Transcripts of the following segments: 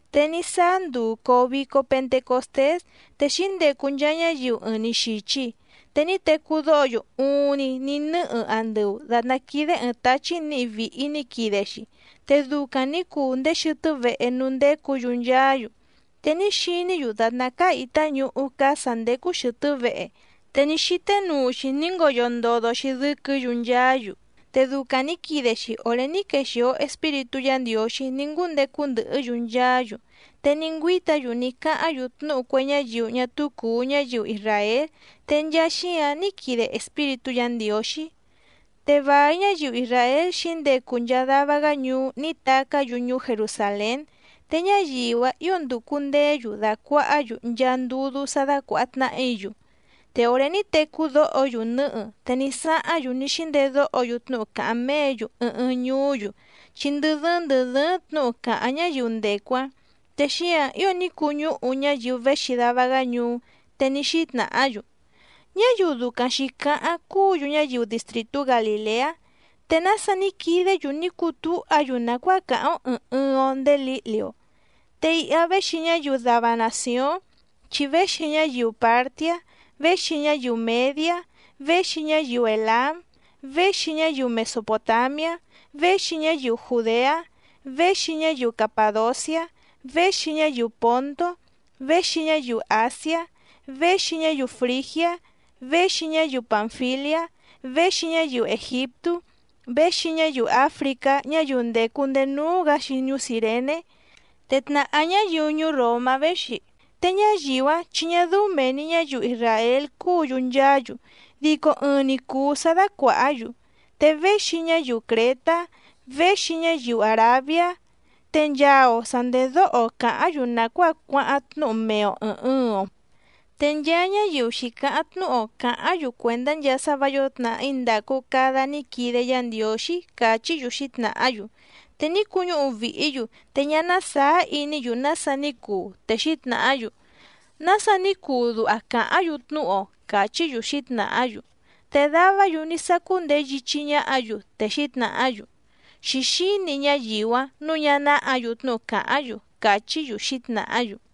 Te ní sáá nduu còo vico Pentecostés te xǐndecu nchaa ñáyiu ɨɨⁿ‑ni xìchi. Te ní tecú dóho‑yu uuⁿni ní nɨ́hɨ andɨu, dàtná quídé ɨ̀ɨⁿ táchí nǐhi vìhi ní quide‑xi, te ducaⁿ nǐ cuu ndéé xɨtɨ́ vehe núú ndécǔ‑yu nchaá‑yu. Te ní xiní‑yu dàtná cáá ìtá ñuhú cáá sǎ ndécú xɨ̀tɨ́ vehe, te ní xíté nuu‑xi ní ngoyo ndodo‑xi dɨ́quɨ̌‑yu nchaá‑yu. Te ducaⁿ nǐ quide‑xi òré ní quexìo Espíritú Yǎ Ndiǒxí ní ngúndecu ndɨhɨ́‑yu nchaá‑yu. Te ní ngüíta‑yu ní cáháⁿ‑yu tnúhu cue ñáyiu ñá túú cùu ñáyiu isràél, te nchaa xíǎⁿ ní quide Espíritú Yǎ Ndiǒxí. Te vài ñáyiu isràél xǐndecu nchaa dava‑gá ñuú ní tacá‑yu ñuú Jerusàlén, te ñáyiu‑áⁿ ǐo ndùcu ndeé‑yu dàcuahá‑yu nchaa ndudú sá dácuàha tnahí‑yu. Te òré ní tecú dóho‑yu nɨ̌hɨ, te ní sáháⁿ‑yu ní xíndedóho‑yu tnúhu càháⁿ méě‑yu ɨɨⁿ ɨɨⁿ ñuú‑yu, chi ndɨ dɨ́ɨ́ⁿ ndɨ̀ dɨ́ɨ́ⁿ tnǔhu càháⁿ ñáyiu ndècu‑áⁿ. Te xíǎⁿ ío ní cuñúhu ñáyiu véxi dava‑gá ñuú, te ní xítnàhá‑yu: —Ñáyiu ducaⁿ xǐcáháⁿ cúǔ‑yu ñáyiu distrìtú Galìleá. ¿Te nása ní quidé‑yu ní cutúha‑yu nàcuáa càháⁿ‑ó ɨ̀ɨⁿ ɨɨⁿ‑o ndéé lǐhli‑o? Te iha véxi ñáyiu dava nàcióⁿ, chi véxi ñáyiu Pàrtiá, véxi ñáyiu Mèdiá, véxi ñáyiu Èlám, véxi ñáyiu Mesopòtamiá, véxi ñáyiu Jùdeá, véxi ñáyiu Capàdociá, véxi ñáyiu Pòntó, véxi ñáyiu Àsiá, véxi ñáyiu Frìgiá, véxi ñáyiu Pànfiliá, véxi ñáyiu Ègiptú, véxi ñáyiu Áfricá ñáyiu ndècu ndéé núú‑gǎ‑xi ñuú Cìrené. Te tnàhá ñáyiu ñuú Ròmá véxi, te ñáyiu‑áⁿ chi ñá dɨ́ú mèe‑ni ñáyiu isràél cúǔ‑yu nchaá‑yu, dico ɨɨⁿ‑ni cùu sá dácuàhá‑yu. Te véxi ñáyiu Crětá, véxi ñáyiu Àrabiá. Te nchaa‑o sa ndèdóho‑o càháⁿ‑yu nàcuáa cuáháⁿ tnúhu mee‑o ɨ̀ɨⁿ ɨɨⁿ‑o. Te nchaa ñáyiu xǐcáháⁿ tnúhu‑o càháⁿ‑yu cuèndá nchaa sá vǎ yǒo tnàhí ndàcu cada ní quide Yá Ndiǒxí —càchí‑yu xǐtnàhá‑yu. Te ní cuñúhu vìhí‑yu, te ñá ná sàá iní‑yu nása ní cuu, te xǐtnàhá‑yu: —¿Nása ní cuu duha càháⁿ‑yu tnúhu‑o? —càchí‑yu xǐtnàhá‑yu. Te davá‑yu ní sácú ndeé yíchí ñáhǎ‑yu, te xǐtnàhá‑yu: —Xǐxíni ñáyiu‑áⁿ nǔu ñá náhǎ‑yu tnúhu càháⁿ‑yu —càchí‑yu xǐtnàhá‑yu.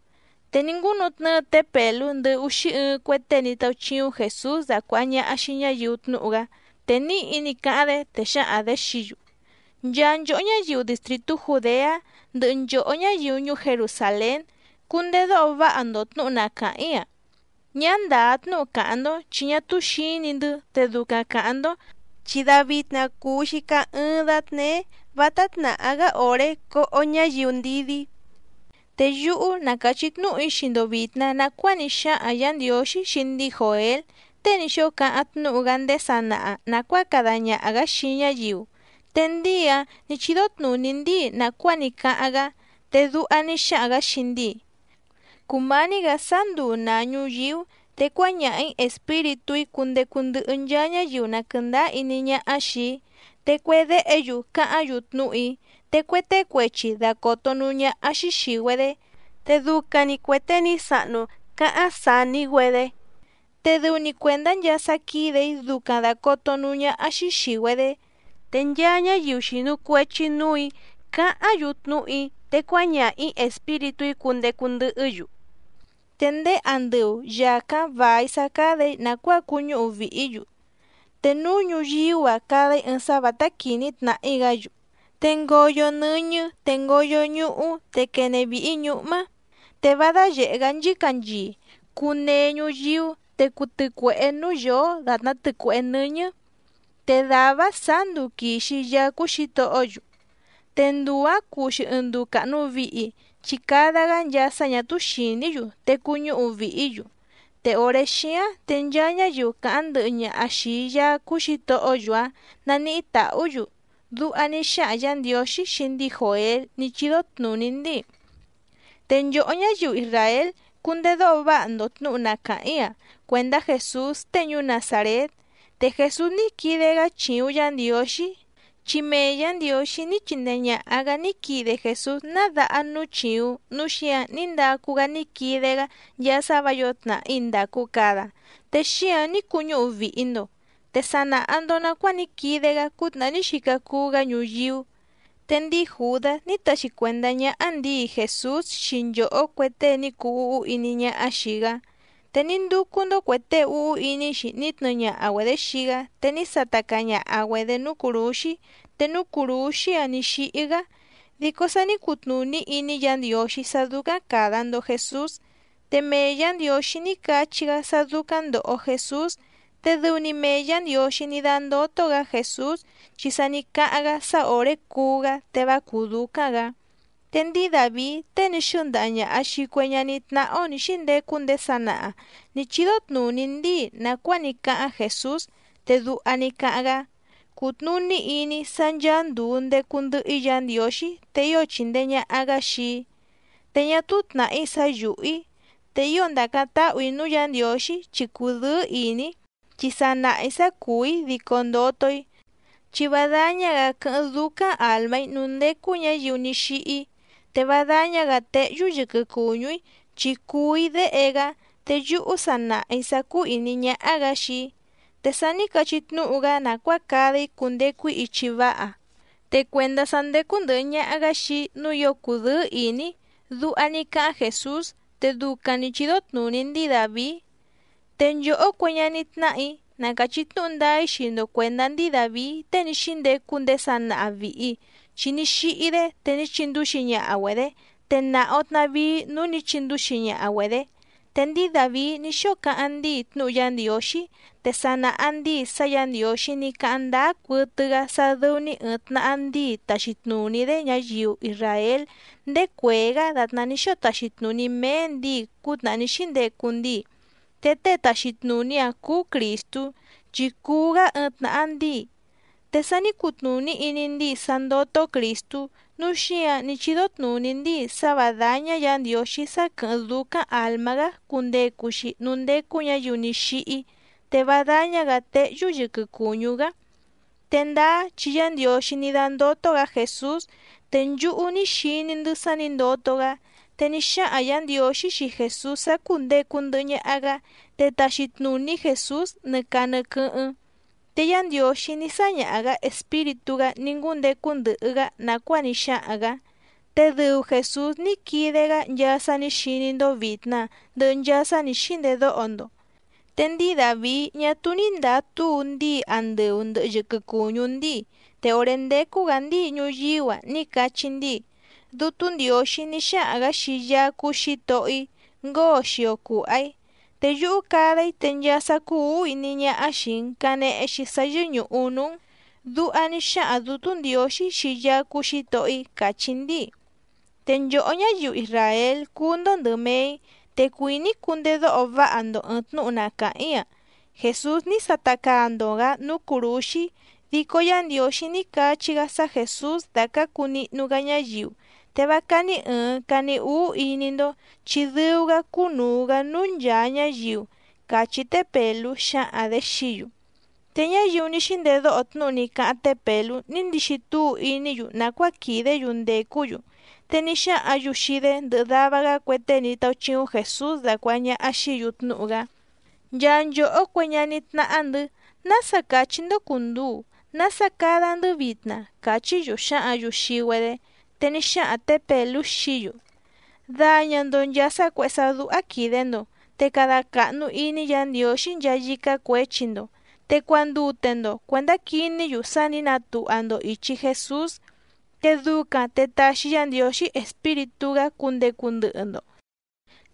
Te ní ngúnutnɨ́ɨ té Pèlú ndɨhɨ úxí ɨɨⁿ cue tée ní táúchíúⁿ Jèsús dacuàha ñaha xii ñáyiu tnúhu‑gá, te níhi ní cáháⁿ‑dé, te xǎhaⁿ‑dě xií‑yu: —Nchaa nchòhó ñáyiu distrìtú Jùdeá ndɨhɨ nchòhó ñáyiu ñuú Jerusàlén, cundedóho váha‑ndo tnǔhu na càháⁿ‑í‑a. Ñá ndàá tnúhu càháⁿ‑ndó, chi ñá túú xǐni‑ndɨ́ te ducaⁿ càháⁿ‑ndó, chi davitna cùu‑xi caá ɨ́ɨ́ⁿ dátnéé, vátá tnàhá‑gá òré coho ñáyiu ndidí. Te yúhú ná càchí tnúhu‑í xii‑ndo vìtna nacuáa ní xáhaⁿ Yǎ Ndiǒxí xii ndíi Jòél tée ní xóo cáháⁿ tnúhu‑gá ndéé sanaha nàcuáa cada ñaha‑gǎ xii ñáyiu, te ndíi‑áⁿ nǐ chídó tnùní ndíi nàcuáa ní cáháⁿ‑gá. Te duha ní xáhaⁿ‑gǎ xii ndíi: Cùmání‑gǎ sáá nduu nàa ñuyíú, te cuáñaha‑ǐ Espíritú‑í cundecu ndɨhɨ nchaa ñáyiu na quɨ̀ndáá iní ñáhá xìi‑í. Te cue déhe‑yu cáháⁿ‑yu tnúhu‑í, te cue tée cuechi dacòto núú ñáhá‑xí xìi‑güedé, te ducaⁿ‑ni cuè tée ni sàhnu cáháⁿ saní‑güedé, te dɨu‑ni cuèndá nchaa sá quídè‑í ducaⁿ dàcoto núú ñáhá‑xí xìi‑güedé. Te nchaa ñáyiu xìnu cuechi núù‑í cáháⁿ‑yu tnúhu‑í, te cuáñaha‑ǐ Espíritú‑í cundecu ndɨhɨ́‑yu. Te ndéé andɨu, yàcáⁿ vài sá cádà‑í nàcuáa cuñúhu vìhí‑yu, te núú ñùyíú‑a cada‑í ɨɨⁿ sá vǎtá quìní tnàhí‑gá‑yu, te ngoyo nɨ́ñɨ́ te ngoyo ñuhú te quene vìhi ñúhmá. Te vá dáyèhé‑gá nchícanchii, cuu nee ñuyíú te cuu tɨcuèhé núú yǒó dàtná tɨcuèhé nɨ́ñɨ́. Te dàvá‑áⁿ sǎá nduu quìxi Yaá cúú Xǐtohó‑yu, te nduu‑ǎⁿ cuu‑xi ɨɨⁿ nduu càhnu vihi, chi cada‑gá nchaa sá ñà túú xìní‑yu, te cuñúhu vìhí‑yu. Te òré xíáⁿ te nchaa ñáyiu càháⁿ ndɨhɨ ñaha xìi Yaá cúú Xǐtohó‑yu‑áⁿ naníhí tàhú‑yu. Duha ní xáhaⁿ Yǎ Ndiǒxí xii ndíi Jòél ní chídó tnùní ndíi. ’Te nchòhó ñáyiu isràél, cundedóho váha‑ndo tnǔhu na càháⁿ‑í‑a cuèndá Jèsús tée ñuú Nazàrét. Te Jèsús ní quide‑gá chìuⁿ Yá Ndiǒxí, chi mee Yǎ Ndiǒxí ní chindee ñàha‑gá ní quide Jèsús ná daha núú chìuⁿ, núu xíǎⁿ ní ndacu‑gá ní quide‑gá nchaa sá vǎ yǒo tnàhí ndàcu cada, te xíǎⁿ ní cuñúhu vìhi‑ndo. Te sa nàha‑ndo nacuáa ní quide‑gá cútnàhá ní xica cuu‑gá ñuyíú. Te ndíi Jùdás ní taxi cuèndá ñáhá ndǐi Jèsús xii nchòhó cue tée ní cuu úhú iní ñáhá xìi‑gá, te ní ndúcú‑ndó cuè tée úhú iní‑xi ní tnɨɨ ñaha‑güedě xii‑gá te ní sata caa ñaha‑güedě núú cùrúxí, te núú cùrúxí‑áⁿ nǐ xíhí‑gá. Dico sa ní cutnùní iní Yǎ Ndiǒxí sá dúcáⁿ càda‑ndo Jesús, te mee Yǎ Ndiǒxí ní cachí‑gá sá dúcáⁿ ndòho Jesús. Te dɨu‑ni mee Yǎ Ndiǒxí ní dándótó‑gǎ Jèsús, chi sa ní cáháⁿ‑gá sá òré cuú‑gá te vá cùú dúcáⁿ‑gǎ. Te ndíi Dàvií tée ní xɨ́ndaha ñàha xii cue ñaní tnáhá‑ó nǐ xíndecu ndéé sanaha nǐ chídó tnùní ndíi nàcuáa ní cáháⁿ Jèsús, te duha ní cáháⁿ‑gá: Cùtnuní iní‑í sá ncháá ndùu ndecu ndɨhɨ‑í Yǎ Ndiǒxí, te ío chìndee ñaha‑gá xii‑í, te ñá túú tnàhí sá yùhú‑í. Te ío ndàcáⁿ táhù‑í núú Yǎ Ndiǒxí chi cùdɨ́ɨ́ ìní‑í, chi sa nàha‑í sá cùú‑í dico ndoto‑í, chi vá dáñá‑gǎ quɨ́hɨ́ⁿ dúcáⁿ àlmá‑í núú ndécú ñǎyiu ní xíhí, te vá dáñá‑gǎ téhyú yɨquɨ cùñú‑í chi cùu‑í Déhe‑gá, te yúhú sa nàha‑í sá cúú ìní ñáhá‑gǎ xii‑í. Te sa ní cachí tnúhu‑gá nàcuáa cada‑í cundecu‑í ichi váha, te cuèndá sá ndécú ndɨ̀hɨ ñaha‑gá xii‑í nǔu ío cùdɨ́ɨ́ ìní‑í. Duha ní cáháⁿ Jèsús, te ducaⁿ nǐ chídó tnùní ndíi Dàvií. ’Te nchòhó cue ñaní tnáhà‑í, na càchí tnúhu ndáá‑í xii‑ndo cuèndá ndíi Dàvií tée ní xíndecu ndéé sanaha vìhi, chi ní xíhí‑dé, te ní chindúxi ñaha‑güedě, te nàha‑o tnavíí núú nǐ chindúxi ñaha‑güedě. Te ndíi Dàvií ní xóo cáháⁿ ndíi tnúhu Yá Ndiǒxí, te sa nàha ndíi sá Yǎ Ndiǒxí ní cáháⁿ ndáá cuɨtɨ‑gá sá dɨ́ú‑ní ɨ̀ɨⁿ tnaha ndíi taxi tnùní‑dé ñáyiu isràél ndéé cuèé‑gá dàtná ní xóo taxi tnùní méé ndǐi cútnàhá ní xíndecu ndíi, te tée taxi tnùní‑áⁿ cúú Crìstú chi cùu‑gá ɨɨⁿ tnàha ndíi. Te sa ní cutnùní iní ndíi sá ndótó Crìstú, núu xíǎⁿ ní chídó tnùní ndíi sá vǎ dáñá Yǎ Ndiǒxí sá quɨ̀hɨ́ⁿ dúcáⁿ àlmá‑gá cundecu‑xi núú ndécú ñǎyiu ní xíhí, te vá dáñá‑gǎ téhyú yɨquɨ cùñú‑gá. ’Te ndáá chi Yá Ndiǒxí ní dándótó‑gǎ Jèsús, te nchúhú ní xiní‑ndɨ́ sá nǐ ndoto‑gá. Te ní xáhaⁿ Yǎ Ndiǒxí xii Jèsús sá cùndecu ndɨhɨ ñaha‑gá, te taxi tnùní Jèsús nɨ caa nɨ quɨ́hɨ́ⁿ. Te Yá Ndiǒxí ní sáñaha‑gǎ Espíritú‑gá ní ngúndecu ndɨhɨ‑gá nàcuáa ní xáhaⁿ‑gǎ, te dɨu Jèsús ní quide‑gá nchaa sá nǐ xiní‑ndó vìtna ndɨhɨ nchaa sá nǐ xíndedóho‑ndo. Te ndíi Dàvií ñá túú ní ndàa túu ndíi andɨu ndɨ̀hɨ yɨquɨ cuñú ndíi, te òré ndécú‑gǎ ndíi ñuyíú‑a ní cachí ndíi: Dútú Ndiǒxí ní xáhaⁿ‑gǎ xii Yaá cúú Xǐtohó‑í: “Ngóo xio cùha‑í, te yúhú cada‑í te nchaa sá cúú ǔhú iní ñáhá xìi‑n canehe‑xi sá yɨ́ñùhu núú‑n.” Duha ní xáhaⁿ Dǔtú Ndiǒxí xii Yaá cúú Xǐtohó‑í càchí ndíi. ’Te nchòhó ñáyiu isràél cùu‑ndo ndɨ mee‑í, te cuìní‑í cundedóho váha‑ndo ɨ̀ɨⁿ tnúhu na càháⁿ‑í‑a. Jèsús ní sata caa‑ndo‑gǎ núú cùrúxí, dico Yá Ndiǒxí ní cachí‑gá sá Jèsús dacǎcu nihnu‑gá ñáyiu, te vá cání ɨ̀ɨⁿ cani úú iní‑ndó, chi dɨu‑gá cúnùu‑gá núú nchàa ñáyiu —càchí té Pèlú xǎhaⁿ‑dě xií‑yu. Te ñáyiu ní xíndedóho tnúhu ní cáháⁿ té Pèlú ní ndixi túu iní‑yu nàcuáa quìdé‑yu ndècú‑yu, te ní xáhǎⁿ‑yu xii‑dé ndɨhɨ dava‑gá cue tée ní táúchíúⁿ Jèsús dacuàha ñaha xií‑yu tnúhu‑gá: —Nchaa nchòhó cue ñaní tnáhá‑ndɨ̌, ¿nása cachí‑ndó cùnduu, nása cada‑ndɨ́ vitna? —càchí‑yu xǎhǎⁿ‑yu xii‑güedé. Te ní xáhaⁿ tě Pèlú xií‑yu: —Daña‑ndo nchàa sá cuèhé sá dúhá quìde‑ndo, te cada càhnu iní Yǎ Ndiǒxí nchaa yícá cuěchi‑ndo. Te cuandute‑ndo cuèndá quiní‑yu sá nǐ natuha‑ndo ìchi Jesús, te ducaⁿ te taxi Yá Ndiǒxí Espíritú‑gá cundecu ndɨhɨ‑ndo,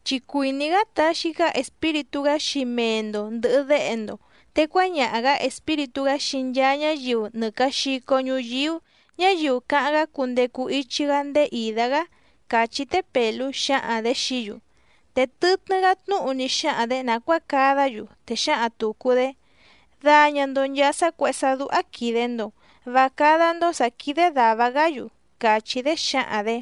chi cuìní‑gá taxi‑gá Espíritú‑gá xii mee‑ndo ndɨ̀hɨ déhe‑ndo, te cuáñaha‑gǎ Espíritú‑gá xii nchaa ñáyiu nɨ càa xico ñuyíú, ñáyiu cáháⁿ‑gá cundecu ichi‑gá ndéé ìdá‑gá —càchí té Pèlú xǎhaⁿ‑dě xií‑yu. Te tɨtnɨ́‑gá tnúhu ní xáhaⁿ‑dě nàcuáa cadá‑yu, te xǎhaⁿ tùcu‑dé: —Daña‑ndo nchàa sá cuèhé sá dúhá quìde‑ndo, vá cádá‑ndó sǎ quídé dàva‑gá‑yu —càchí‑dé xǎhaⁿ‑dě.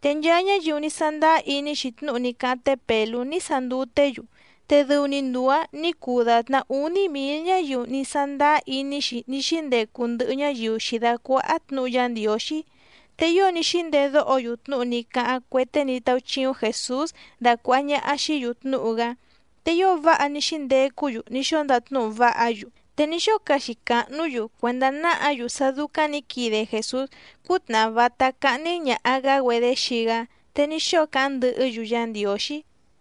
Te nchaa ñáyiu ní sándáá iní‑xi tnúhu ní cáháⁿ té Pèlú ní sanduté‑yu, te dɨu‑ni nduu‑ǎⁿ nǐ cuu dàtná úní mǐl ñáyiu ní sándáá iní‑xi ní xíndecu ndɨhɨ ñáyiu xǐdácuáhá tnǔhu Yá Ndiǒxí. Te ío ní xíndedóho‑yu tnúhu ní cáháⁿ cue tée ní táúchíúⁿ Jèsús dacuàha ñaha xií‑yu tnúhu‑gá, te ío váha ní xíndecú‑yu ní xóo ndatnúhu váha‑yu. Te ní xóo caxi càhnú‑yu cuèndá náhǎ‑yu sá dúcáⁿ nǐ quide Jèsús cútnàhá vátá cáhní ñàha‑gá‑güedé xii‑gá, te ní xóo cáháⁿ ndɨhɨ́‑yu Yá Ndiǒxí.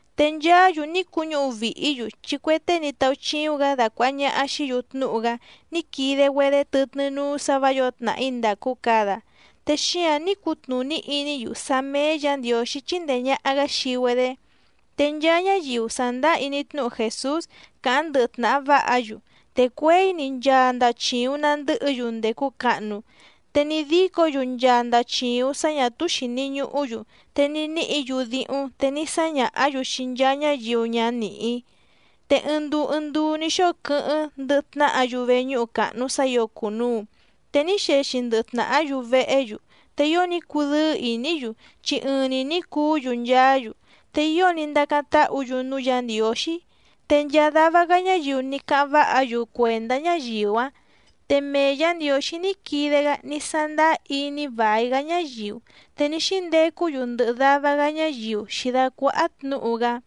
Te nchaá‑yu ní cuñúhu vìhí‑yu, chi cue tée ní táúchíúⁿ‑gǎ dacuàha ñaha xií‑yu tnúhu‑gá ní quide‑güedé tɨtnɨ́ núú sǎ vǎ yǒo tnàhí ndàcu cada, te xíǎⁿ ní cutnùní iní‑yu sá méé Yǎ Ndiǒxí chíndèe ñaha‑gá xii‑güedé. Te nchaa ñáyiu sàndáá iní tnúhu Jèsús càháⁿ ndɨhɨ tnàha váha‑yu, te cuěi‑ni nchaa ndachìuⁿ nandɨ́hɨ‑yu ndècu cahnu. Te ní dícǒ‑yu nchaa ndachìuⁿ sá ñà túú xìni ñuhú‑yu, te ní níhǐ‑yu díhúⁿ te ní sáñàhá‑yu xii nchaa ñáyiu ñá nìhí. Te ɨɨⁿ nduu ɨɨⁿ nduu ní xóo quɨ́hɨ́ⁿ ndɨhɨ tnàhá‑yu veñúhu càhnu sá ǐo cùnuu. Te ní xexi ndɨhɨ tnàhá‑yu vehé‑yu. Te ío ní cudɨ́ɨ́ ìní‑yu chi ɨɨⁿ‑ni ní cuú‑yu nchaá‑yu. Te ío ní ndacáⁿ táhǔ‑yu núú Yǎ Ndiǒxí, te nchaa dava‑gá ñáyiu ní cáháⁿ váha‑yu cuèndá ñáyiu‑áⁿ. Te mee Yǎ Ndiǒxí ní quide‑gá ní sándáá iní vài‑gá ñáyiu, te ní xíndecú‑yu ndɨhɨ dava‑gá ñáyiu xǐdácuáhá tnǔhu‑gá.